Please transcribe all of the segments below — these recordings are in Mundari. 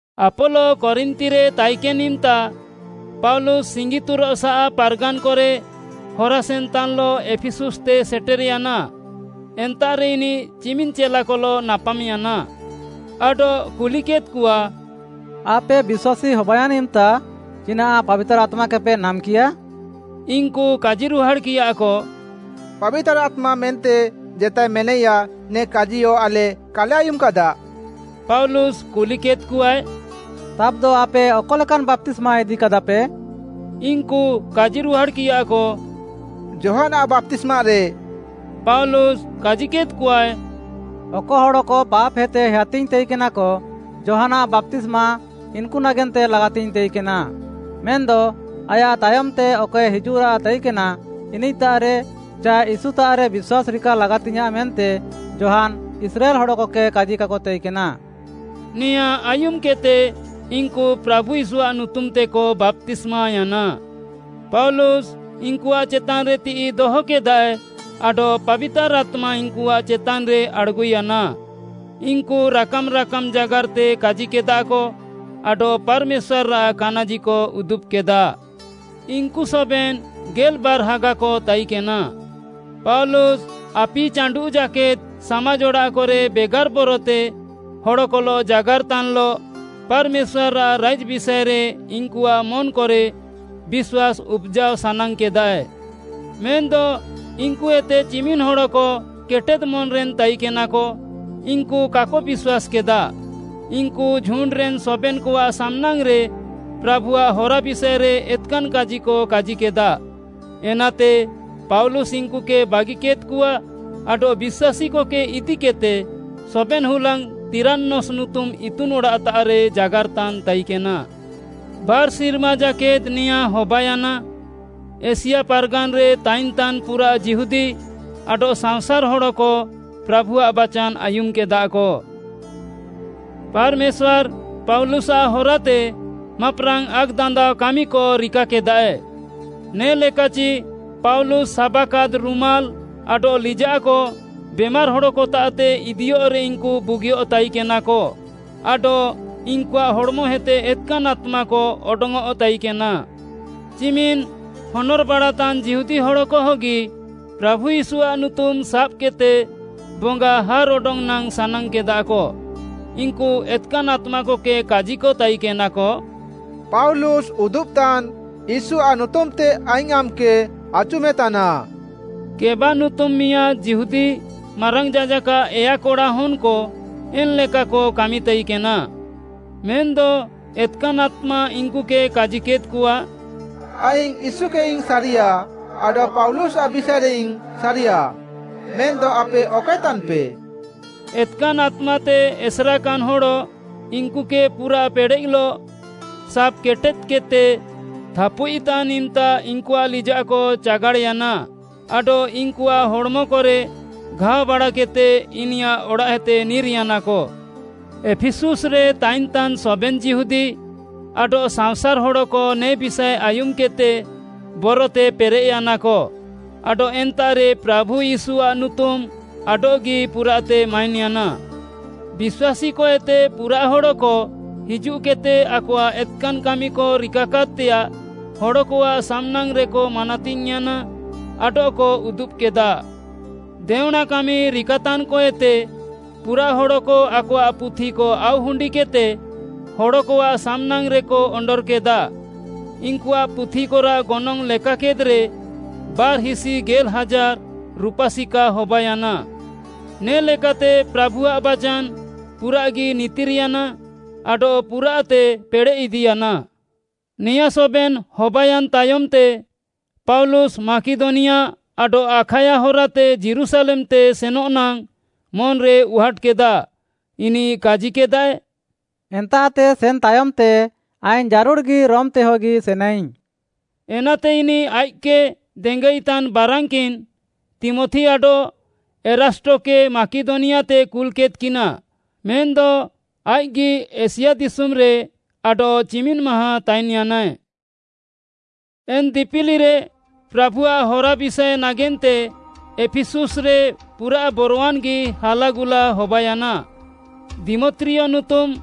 ଆପୋଲୋ କରିନ୍ଥିରେ ତାଇକେନ୍‌ ଇମ୍‌ତା, ପାଉଲୁସ୍‌ ସିଙ୍ଗିତୁରଃସାଃ ପାର୍‌ଗାନ୍‌କରେ ହରାସେନ୍‌ତାନ୍‌ଲଃ ଏଫିସୁସ୍‌ତେ ସେଟେର୍‌ୟାନା। ଏନ୍ତାଃରେ ଇନିଃ ଚିମିନ୍‌ ଚେଲାକଲଃ ନାପାମ୍‌ୟାନା ଆଡଃ କୁଲିକେଦ୍‍କଆ, “ଆପେ ବିଶ୍ୱାସୀ ହବାୟାନ୍‌ ଇମ୍‌ତା ଚିନାଃ ପାବିତାର୍‍ ଆତ୍ମାକେପେ ନାମ୍‍କିୟା?” ଇନ୍‌କୁ କାଜିରୁହାଡ଼୍‌କିୟାକ, “ପାବିତାର୍‌ ଆତ୍ମା ମେନ୍ତେ ଜେତାଏ ମେନାଇୟା, ନେ କାଜିୟ ଆଲେ କାଲେ ଆୟୁମ୍‌କାଦା।” ପାଉଲୁସ୍‌ କୁଲିକେଦ୍‌କଆଏ, “ତାବ୍‍ଦ, ଆପେ ଅକ ଲେକାନ୍‌ ବାପ୍ତିସ୍ମା ଇଦିକାଦାପେ?” ଇନ୍‌କୁ କାଜିରୁହାଡ଼୍‌କିୟାକ, “ଯୋହାନ୍‌ଆଃ ବାପ୍ତିସ୍ମାରେ।” ପାଉଲୁସ୍‌ କାଜିକେଦ୍‌କଆଏ, “ଅକ ହଡ଼କ ପାପ୍‌ହେତେ ହେୟାତିଙ୍ଗ୍‌ ତାଇକେନାକ, ଯୋହାନ୍‌ଆଃ ବାପ୍ତିସ୍ମା ଇନ୍‌କୁ ନାଗେନ୍ତେ ଲାଗାତିଙ୍ଗ୍‌ ତାଇକେନା। ମେନ୍‌ଦ ଆୟାଃ ତାୟମ୍‌ତେ ଅକଏ ହିଜୁଃରାଃ ତାଇକେନା, ଇନିଃତାଃରେ ଚାଏ ୟୀଶୁତାଃରେ ବିଶ୍ୱାସ୍‌ ରିକା ଲାଗାତିୟାଃଁ ମେନ୍ତେ ଯୋହାନ୍‌ ଇସ୍ରାଏଲ୍‌ ହଡ଼କକେ କାଜିକାକ ତାଇକେନା।” ନେଆଁଁ ଆୟୁମ୍‌କେଦ୍‌ତେ ଇନ୍‌କୁ ପ୍ରାଭୁ ୟୀଶୁଆଃ ନୁତୁମ୍‌ତେକ ବାପ୍ତିସ୍ମାୟାନା। ପାଉଲୁସ୍‌ ଇନ୍‌କୁଆଃ ଚେତାନ୍‌ରେ ତିଃଇ ଦହକେଦାଏ ଆଡଃ ପାବିତାର୍‌ ଆତ୍ମା ଇନ୍‌କୁ ଚେତାନ୍‌ରେ ଆଡ଼୍‌ଗୁୟାନା। ଇନ୍‌କୁ ରାକାମ୍‌ ରାକାମ୍‌ ଜାଗାର୍‌ତେ କାଜିକେଦାକ ଆଡଃ ପାର୍‌ମେଶ୍ୱାର୍‌ଆଃ କାନାଜିକ ଉଦୁବ୍‌କେଦା। ଇନ୍‌କୁ ସବେନ୍‌ ଗେଲ୍‌ବାର୍‌ ହାଗାକ ତାଇକେନା। ପାଉଲୁସ୍‌ ଆପି ଚାଣ୍ଡୁଃ ଜାକେଦ୍‌ ସାମାଜ୍‌ ଅଡ଼ାଃକରେ ବେଗାର୍‌ ବରତେ ହଡ଼କଲଃ ଜାଗାର୍‌ତାନ୍‌ଲଃ ପାର୍‌ମେଶ୍ୱାର୍‌ଆଃ ରାଇଜ୍‌ ବିଷାଏରେ ଇନ୍‌କୁଆଃ ମନ୍‌କରେ ବିଶ୍ୱାସ୍‌ ଉପ୍‌ଜାଅ ସାନାଙ୍ଗ୍‌କେଦାଏ। ମେନ୍‌ଦ ଇନ୍‌କୁଏତେ ଚିମିନ୍‌ ହଡ଼କ କେଟେଦ୍‌ ମନ୍‌ରେନ୍‌ ତାଇକେନାକ, ଇନ୍‌କୁ କାକ ବିଶ୍ୱାସ୍‌କେଦା। ଇନ୍‌କୁ ଝୁଣ୍ଡ୍‌ରେନ୍‌ ସବେନ୍‌କଆଃ ସାମ୍‌ନାଙ୍ଗ୍‌ରେ ପ୍ରାଭୁଆଃ ହରା ବିଷାଏରେ ଏତ୍‌କାନ୍‌ କାଜିକ କାଜିକେଦା। ଏନାତେ ପାଉଲୁସ୍‌ ଇନ୍‌କୁକେ ବାଗିକେଦ୍‌କଆ ଆଡଃ ବିଶ୍ୱାସୀକକେ ଇଦିକେଦ୍‌ତେ ସବେନ୍‌ ହୁଲାଙ୍ଗ୍‌ ତିରାନସ୍‌ ନୁତୁମ୍‌ ଇତୁନ୍‌ ଅଡ଼ାଃତାଃରେ ଜାଗାର୍‌ତାନ୍‌ ତାଇକେନା। ବାର୍‌ ସିର୍ମା ଜାକେଦ୍‌ ନେଆଁଁ ହବାୟାନା। ଏସିଆ ପାର୍‌ଗାନ୍‌ରେ ତାଇନ୍‌ତାନ୍‌ ପୁରାଃ ଯିହୁଦୀ ଆଡଃ ସାଅଁସାର୍‌ ହଡ଼କ ପ୍ରାଭୁଆଃ ବାଚାନ୍‌ ଆୟୁମ୍‌କେଦାକ। ପାର୍‌ମେଶ୍ୱାର୍‌ ପାଉଲୁସ୍‌ଆଃ ହରାତେ ମାପ୍‍ରାଙ୍ଗ୍‌ ଆକ୍‌ଦାନ୍ଦାଅ କାମିକଏ ରିକାକେଦା। ନେ'ଲେକାଚି ପାଉଲୁସ୍‌ ସାବାକାଦ୍‌ ରୁମାଲ୍‌ ଆଡଃ ଲିଜାଃକ ବେମାର୍‌ ହଡ଼କତାଃତେ ଇଦିୟଃରେ ଇନ୍‌କୁ ବୁଗିୟଃ ତାଇକେନାକ ଆଡଃ ଇନ୍‌କୁଆଃ ହଡ଼୍‌ମଏତେ ଏତ୍‌କାନ୍‌ ଆତ୍ମାକ ଅଡଙ୍ଗ୍‌ଅଃ ତାଇକେନା। ଚିମିନ୍‌ ହନର୍‌ବାଡ଼ାତାନ୍ ଯିହୁଦୀ ହଡ଼କହଗି ପ୍ରାଭୁ ୟୀଶୁଆଃ ନୁତୁମ୍‌ ସାବ୍‌କେଦ୍‌ତେ ବଙ୍ଗା ହାର୍‌ଅଡଙ୍ଗ୍‌ ନାଙ୍ଗ୍‌ ସାନାଙ୍ଗ୍‌କେଦାକ। ଇନ୍‌କୁ ଏତ୍‌କାନ୍‌ ଆତ୍ମାକକେ କାଜିକ ତାଇକେନାକ, “ପାଉଲୁସ୍‌ ଉଦୁବ୍‌ତାନ୍‌ ୟୀଶୁଆଃ ନୁତୁମ୍‌ତେ ଆଇଙ୍ଗ୍‌ ଆମ୍‌କେ ଆଚୁମେତାନା।” ସ୍କେବା ନୁତୁମ୍‌ ମିଆଁଦ୍‌ ଯିହୁଦୀ ମାରାଙ୍ଗ୍‌ ଯାଜାକ୍‌ଆଃ ଏୟା କଡ଼ା ହନ୍‍କ ଏନ୍‍ଲେକାକ କାମିତାଇକେନା। ମେନ୍‌ଦ ଏତ୍‍କାନ୍‍ ଆତ୍ମା ଇନ୍‌କୁକେ କାଜିକେଦ୍‌କଆ, “ଆଇଙ୍ଗ୍‌ ୟୀଶୁକେଇଙ୍ଗ୍‌ ସାରିୟା ଆଡଃ ପାଉଲୁସ୍‌ଆଃ ବିଷାଏରେଇଙ୍ଗ୍‌ ସାରିୟା, ମେନ୍‌ଦ ଆପେ ଅକଏ ତାନ୍‌ପେ?” ଏତ୍‍କାନ୍‍ ଆତ୍ମାତେ ଏସେରେକାନ୍‌ ହଡ଼, ଇନ୍‌କୁକେ ପୁରାଃ ପେଡ଼େଃଲଃ ସାବ୍‌କେଟେଦ୍‌କେଦ୍‌ତେ ଥାପୁଇଃତାନ୍‌ ଇମ୍‌ତା ଇନ୍‌କୁଆଃ ଲିଜାଃକ ଚାଗାଡ଼୍‌ୟାନା ଆଡଃ ଇନ୍‌କୁଆଃ ହଡ଼୍‌ମକରେ ଘାଅବାଡ଼ାକେଦ୍‌ତେ ଇନିୟାଃ ଅଡ଼ାଃଏତେ ନିର୍‌ୟାନାକ। ଏଫିସୁସ୍‌ରେ ତାଇନ୍‍ତାନ୍ ସବେନ୍‌ ଯିହୁଦୀ ଆଡଃ ସାଅଁସାର୍‌ ହଡ଼କ ନେ ବିଷାଏ ଆୟୁମ୍‌କେଦ୍‌ତେ ବରତେ ପେରେଃୟାନାକ ଆଡଃ ଏନ୍ତାଃରେ ପ୍ରାଭୁ ୟୀଶୁଆଃ ନୁତୁମ୍‌ ଆଡଃଗି ପୁରାଃତେ ମାଇନ୍‌ୟାନା। ବିଶ୍ୱାସୀକଏତେ ପୁରାଃ ହଡ଼କ ହିଜୁଃକେଦ୍‍ତେ ଆକଆଃ ଏତ୍‌କାନ୍‌ କାମିକ ରିକାକାଦ୍‌ତେୟାଃ ହଡ଼କଆଃ ସାମ୍‌ନାଙ୍ଗ୍‌ରେକ ମାନାତିଙ୍ଗ୍‌ୟାନା ଆଡଃକ ଉଦୁବ୍‍କେଦା। ଦେଅଁଣାକାମି ରିକାତାନ୍‍କଏତେ ପୁରାଃ ହଡ଼କ ଆକଆଃ ପୁଥିକ ଆଉ ହୁଣ୍ଡିକେଦ୍‌ତେ ହଡ଼କଆଃ ସାମ୍‍ନାଙ୍ଗ୍‌ରେକ ଅଣ୍ଡର୍‌କେଦା। ଇନ୍‌କୁଆଃ ପୁଥିକରାଃ ଗନଙ୍ଗ୍‌ ଲେକାକେଦ୍‌ରେ ବାର୍‌ହିସି ଗେଲ୍‌ ହାଜାର୍‌ ରୁପା ସିକା ହବାୟାନା। ନେ'ଲେକାତେ ପ୍ରାଭୁଆଃ ବାଚାନ୍‌ ପୁରାଃଗି ନିତିର୍‌ୟାନା ଆଡଃ ପୁରାଃତେ ପେଡ଼େଃଇଦିୟାନା। ନେଆଁଁ ସବେନ୍‌ ହବାୟାନ୍‌ ତାୟମ୍‌ତେ ପାଉଲୁସ୍‌ ମାକିଦନିଆ ଆଡଃ ଆଖାୟା ହରାତେ ଯୀରୁଶାଲେମ୍‌ତେ ସେନଃ ନାଙ୍ଗ୍‌ ମନ୍‌ରେ ଉହାଟ୍‌କେଦା। ଇନିଃ କାଜିକେଦାଏ, “ଏନ୍ତାଃତେ ସେନ୍‌ ତାୟମ୍‌ତେ ଆଇଙ୍ଗ୍‌ ଜାରୁଡ଼୍‌ଗି ରୋମ୍‌ତେହଗି ସେନାଇଙ୍ଗ୍‌।” ଏନାତେ ଇନିଃ ଆଇଃକ୍‌କେ ଦେଙ୍ଗାଇତାନ୍‌ ବାରାନ୍‌କିନ୍‌ ତୀମଥି ଆଡଃ ଏରାଷ୍ଟକେ ମାକିଦନିଆତେ କୁଲ୍‌କେଦ୍‌କିନା, ମେନ୍‌ଦ ଆଇଃକ୍‌ଗି ଏସିଆ ଦିଶୁମ୍‌ରେ ଆଡଃଚିମିନ୍‌ ମାହାଁ ତାଇନ୍‌ୟାନାଏ। ଏନ୍‌ ଦିପିଲିରେ ପ୍ରାଭୁଆଃ ହରା ବିଷାଏ ନାଗେନ୍ତେ ଏଫିସୁସ୍‌ରେ ପୁରାଃ ବରୱାନ୍‌ଗି ହାଲାଗୁଲା ହବାୟାନା। ଦିମତ୍ରିୟ ନୁତୁମ୍‌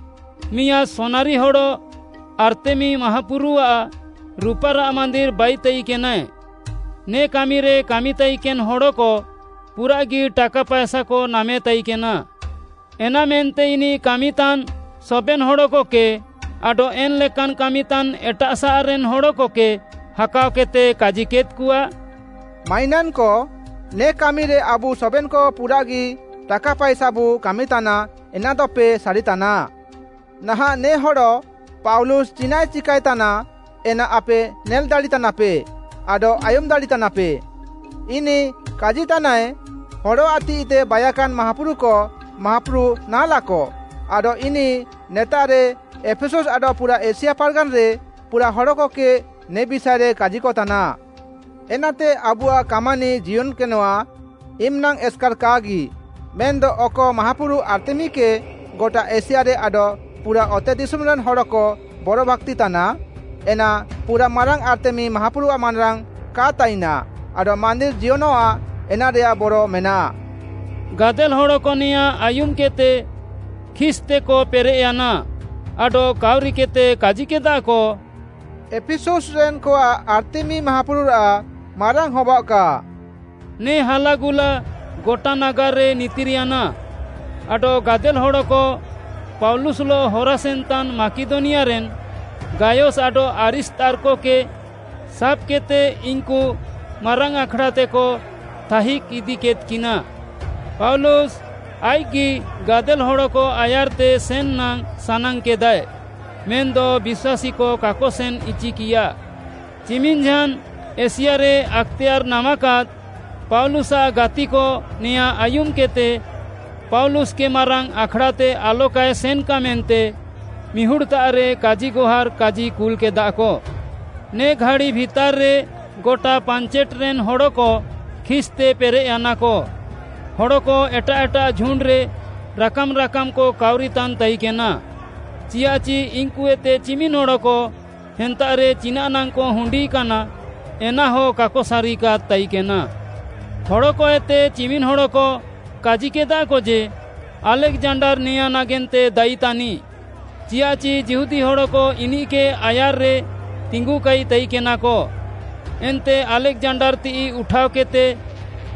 ମିଆଁଦ୍‌ ସୁନାରିହଡ଼ ଆର୍ତ୍ତେମୀ ମାହାପୁରୁଆଃ ରୁପାରାଃ ମାନ୍ଦିର୍‌ ବାଇତାଇକେନାଏ, ନେ କାମିରେ କାମିତାଇକେନ୍‌ ହଡ଼କ ପୁରାଃଗି ଟାକା ପାଏସାକ ନାମେ ତାଇକେନା। ଏନାମେନ୍ତେ ଇନିଃ କାମିତାନ୍‌ ସବେନ୍‌ ହଡ଼କକେ ଆଡଃ ଏନ୍‌ ଲେକାନ୍‌ କାମିତାନ୍‌ ଏଟାଃସାଃରେନ୍‌ ହଡ଼କକେ ହାକାଅକେଦ୍‌ତେ କାଜିକେଦ୍‌କଆ, “ମାଇନାନ୍‌କ, ନେ କାମିରେ ଆବୁ ସବେନ୍‌କ ପୁରାଃଗି ଟାକା ପାଏସାବୁ କାମିତାନା ଏନାଦପେ ସାରିତାନା। ନାହାଁଃ ନେ ହଡ଼ ପାଉଲୁସ୍‌ ଚିନାଃଏ ଚିକାଏତାନା, ଏନା ଆପେ ନେଲ୍‌ ଦାଡ଼ିତାନାପେ ଆଡଃ ଆୟୁମ୍‌ ଦାଡ଼ିତାନାପେ। ଇନିଃ କାଜିତାନାଏ, ହଡ଼ଆଃ ତିଃଇତେ ବାଇକାନ୍‌ ମାହାପୁରୁକ ମାହାପୁରୁ ନାହାଁଲାକ, ଆଡଃ ଇନିଃ ନେତାଃରେ ଏଫିସୁସ୍‌ ଆଡଃ ପୁରା ଏସିଆ ପାର୍‌ଗାନ୍‌ରେ ପୁରାଃ ହଡ଼କକେ ନେ ବିଷାଏରେ କାଜିକତାନା। ଏନାତେ ଆବୁଆଃ କାମାନି ଜିୟନ୍‌କେନଃଆ, ଇମ୍‌ନାଙ୍ଗ୍‌ ଏସ୍‌କାର୍‌ କାହାଗି, ମେନ୍‌ଦ ଅକ ମାହାପୁରୁ ଆର୍ତ୍ତେମୀକେ ଗଟା ଏସିଆରେ ଆଡଃ ପୁରା ଅତେଦିଶୁମ୍‌ରେନ୍‌ ହଡ଼କ ବରଭାକ୍ତିତାନା, ଏନ୍‌ ପୁରାଃମାରାଙ୍ଗ୍‌ ଆର୍ତ୍ତେମୀ ମାହାପୁରୁଆଃ ମାନାରାଙ୍ଗ୍‌ କା ତାଇନା ଆଡଃ ମାନ୍ଦିର୍‌ ଜିୟନଃଆ, ଏନାରେୟାଃ ବରମେନାଃ।” ଗାଦେଲ୍‌ ହଡ଼କ ନେଆଁଁ ଆୟୁମ୍‌କେଦ୍‌ତେ ଖିସ୍‍ତେକ ପେରେଃୟାନା ଆଡଃ କାଉରିକେଦ୍‍ତେ କାଜିକେଦାକ, “ଏଫିସୁସ୍‌ରେନ୍‌କଆଃ ଆର୍ତ୍ତେମୀ ମାହାପୁରୁଆଃ ମାରାଙ୍ଗ୍‌ ହବାଅଃକା।” ନେ ହାଲାଗୁଲା ଗଟା ନାଗାର୍‌ରେ ନିତିର୍‌ୟାନା। ଆଡଃ ଗାଦେଲ୍‌ ହଡ଼କ ପାଉଲୁସ୍‌ଲଃ ହରାସେନ୍‌ତାନ୍‌ ମାକିଦନିଆରେନ୍‌ ଗାୟସ୍‌ ଆଡଃ ଆରିସ୍ତାର୍ଖକେ ସାବ୍‌କେଦ୍‌ତେ ଇନ୍‌କୁ ମାରାଙ୍ଗ୍‌ ଆଖ୍‌ଡ଼ାତେକ ଥାଇଜ୍‌ ଇଦିକେଦ୍‌କିନା। ପାଉଲୁସ୍‌ ଆଇଃକ୍‌ଗି ଗାଦେଲ୍‌ ହଡ଼କ ଆୟାର୍‌ତେ ସେନ୍‌ ନାଙ୍ଗ୍‌ ସାନାଙ୍ଗ୍‌କେଦାଏ, ମେନ୍‌ଦ ବିଶ୍ୱାସୀକ କାକ ସେନ୍‌ ଇଚିକିୟା। ଚିମିନ୍‌ଝାନ୍‌ ଏସିଆରେ ଆକ୍‌ତେୟାର୍‌ ନାମାକାଦ୍‌ ପାଉଲୁସ୍‌ଆଃ ଗାତିକ ନେଆଁ ଆୟୁମ୍‌କେଦ୍‌ତେ ପାଉଲୁସ୍‌କେ ମାରାଙ୍ଗ୍‌ ଆଖ୍‌ଡ଼ାତେ ଆଲକାଏ ସେନ୍‌କା ମେନ୍ତେ ମିହୁଡ଼୍‌ତାଃରେ କାଜିଗହାର୍‌ କାଜିକୁଲ୍‌କେଦାକ। ନେ ଘାଡ଼ି ଭିତାର୍‌ରେ ଗଟା ପାଞ୍ଚେଟ୍‌ରେନ୍‌ ହଡ଼କ ଖିସ୍‌ତେ ପେରେଃୟାନାକ। ହଡ଼କ ଏଟାଃ ଏଟାଃ ଝୁଣ୍ଡ୍‌ରେ ରାକାମ୍‌ ରାକାମ୍‌କ କାଉରିତାନ୍‌ ତାଇକେନା, ଚିଆଃଚି ଇନ୍‌କୁଏତେ ଚିମିନ୍‌ ହଡ଼କ ଏନ୍ତାଃରେ ଚିନାଃନାଙ୍ଗ୍‌କ ହୁଣ୍ଡିକାନା ଏନାହ କାକ ସାରିକାଦ୍‌ ତାଇକେନା। ହଡ଼କଏତେ ଚିମିନ୍‌ ହଡ଼କ କାଜିକେଦାକ ଯେ, ଆଲେକ୍‌ଜାଣ୍ଡାର୍‌ ନେଆଁ ନାଗେନ୍ତେ ଦାୟୀ ତାନିଃ, ଚିଆଃଚି ଯିହୁଦୀ ହଡ଼କ ଇନିଃକେ ଆୟାର୍‌ରେ ତିଙ୍ଗୁକାଇ ତାଇକେନାକ। ଏନ୍ତେ ଆଲେକ୍‌ଜାଣ୍ଡାର୍‌ ତିଃଇ ଉଠାଅକେଦ୍‌ତେ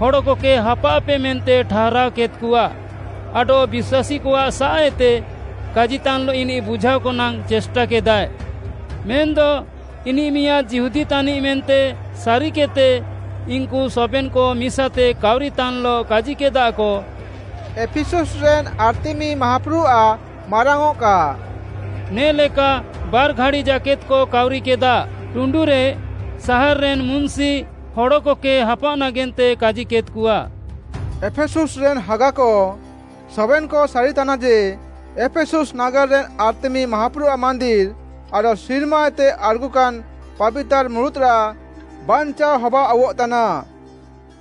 ହଡ଼କକେ ହାପାଅଃପେ ମେନ୍ତେ ଠାରାଅକେଦ୍‌କଆ ଆଡଃ ବିଶ୍ୱାସୀକଆଃସାଃଏତେ କାଜିତାନ୍‌ଲଃ ଇନିଃ ବୁଝାଅକ ନାଙ୍ଗ୍‌ ଚେଷ୍ଟାକେଦାଏ। ମେନ୍‌ଦ ଇନିଃ ମିଆଁଦ୍‌ ଯିହୁଦୀ ତାନିଃ, ମେନ୍ତେ ସାରିକେଦ୍‌ତେ ଇନ୍‌କୁ ସବେନ୍‌କ ମିସାତେ କାଉରିତାନ୍‌ଲଃ କାଜିକେଦାକ, “ଏଫିସୁସ୍‌ରେନ୍‌ ଆର୍ତ୍ତେମୀ ମାହାପୁରୁଆଃ ମାରାଙ୍ଗ୍‌ଅଃକା।” ନେ'ଲେକା ବାର୍‌ ଘାଡ଼ି ଜାକେଦ୍‌କ କାଉରିକେଦା। ଟୁଣ୍ଡୁରେ ସାହାର୍‌ରେନ୍‌ ମୁନ୍‌ସି ହଡ଼କକେ ହାପାଅଃ ନାଗେନ୍ତେ କାଜିକେଦ୍‌କଆ, “ଏଫିସୁସ୍‌ରେନ୍‌ ହାଗାକ, ସବେନ୍‌କ ସାରିତାନା ଯେ, ଏଫିସୁସ୍‌ ନାଗାର୍‌ରେନ୍‌ ଆର୍ତ୍ତେମୀ ମାହାପୁରୁଆଃ ମାନ୍ଦିର୍‌ ଆଡଃ ସିର୍ମାଏତେ ଆଡ଼୍‌ଗୁକାନ୍‌ ପାବିତାର୍‌ ମୁରୁତ୍‌ରାଃ ବାଞ୍ଚାଅ ହବାଆଉଃତାନା।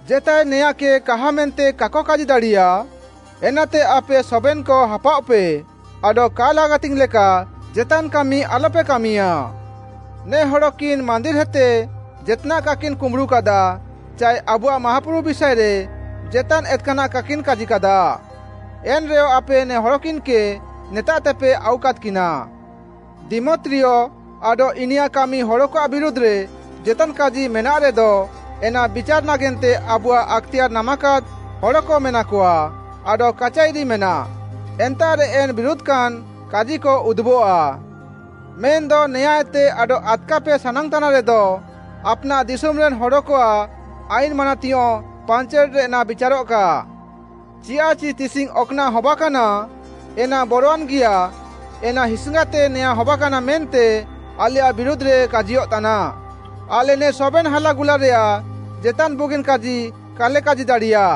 ଜେତାଏ ନେଆଁକେ କାହା ମେନ୍ତେ କାକ କାଜି ଦାଡ଼ିୟା। ଏନାତେ ଆପେ ସବେନ୍‌କ ହାପାଅଃପେ ଆଡଃ କା ଲାଗାତିଙ୍ଗ୍‌ ଲେକା ଜେତାନ୍‌ କାମି ଆଲପେ କାମିୟା। ନେ ହଡ଼କିନ୍‌ ମାନ୍ଦିର୍‌ହେତେ ଜେତ୍‌ନାଃ କାକିନ୍‌ କୁମ୍ବୁଡ଼ୁକାଦା, ଚାଏ ଆବୁଆଃ ମାହାପୁରୁ ବିଷାଏରେ ଜେତାନ୍‌ ଏତ୍‌କାନାଃ କାକିନ୍‌ କାଜିକାଦା, ଏନ୍‌ରେୟ ଆପେ ନେ ହଡ଼କିନ୍‌କେ ନେତାଃତେପେ ଆଉକାଦ୍‌କିନା। ଦିମତ୍ରିୟ ଆଡଃ ଇନିୟାଃ କାମି ହଡ଼କଆଃ ବିରୁଧ୍‌ରେ ଜେତାନ୍‌ କାଜି ମେନାଃରେଦ, ଏନା ବିଚାରେ ନାଗେନ୍ତେ ଆବୁଆଃ ଆକ୍‌ତେୟାର୍‌ ନାମାକାଦ୍‌ ହଡ଼କ ମେନାକଆ ଆଡଃ କାଚାଇରି ମେନାଃ, ଏନ୍ତାଃରେ ଏନ୍‌ ବିରୁଧ୍‌କାନ୍‌ କାଜିକ ଉଦୁବଃଆ। ମେନ୍‌ଦ ନେଆଁଏତେ ଆଡଃ ଆଦ୍‌କାପେ ସାନାଙ୍ଗ୍‌ତାନ୍‌ରେଦ, ଆପ୍‌ନାଃ ଦିଶୁମ୍‌ରେନ୍‌ ହଡ଼କଆଃ ଆଇନ୍‌ ମାନାତିୟଁଃ ପାଞ୍ଚେଟ୍‌ରେ ଏନା ବିଚାରଃକା। ଚିଆଃଚି ତିସିଙ୍ଗ୍‌ ଅକ୍‌ନାଃ ହବାକାନା, ଏନା ବରୱାନ୍‌ଗିଆ ଏନା ହିସିଙ୍ଗାତେ ନେଆଁ ହବାକାନା ମେନ୍ତେ ଆଲେୟାଃ ବିରୁଧ୍‌ରେ କାଜିୟଃତାନା। ଆଲେ ନେ ସବେନ୍‌ ହାଲାଗୁଲାରେୟାଃ ଜେତାନ୍‌ ବୁଗିନ୍‌ କାଜି କାଲେ କାଜି ଦାଡ଼ିୟା।”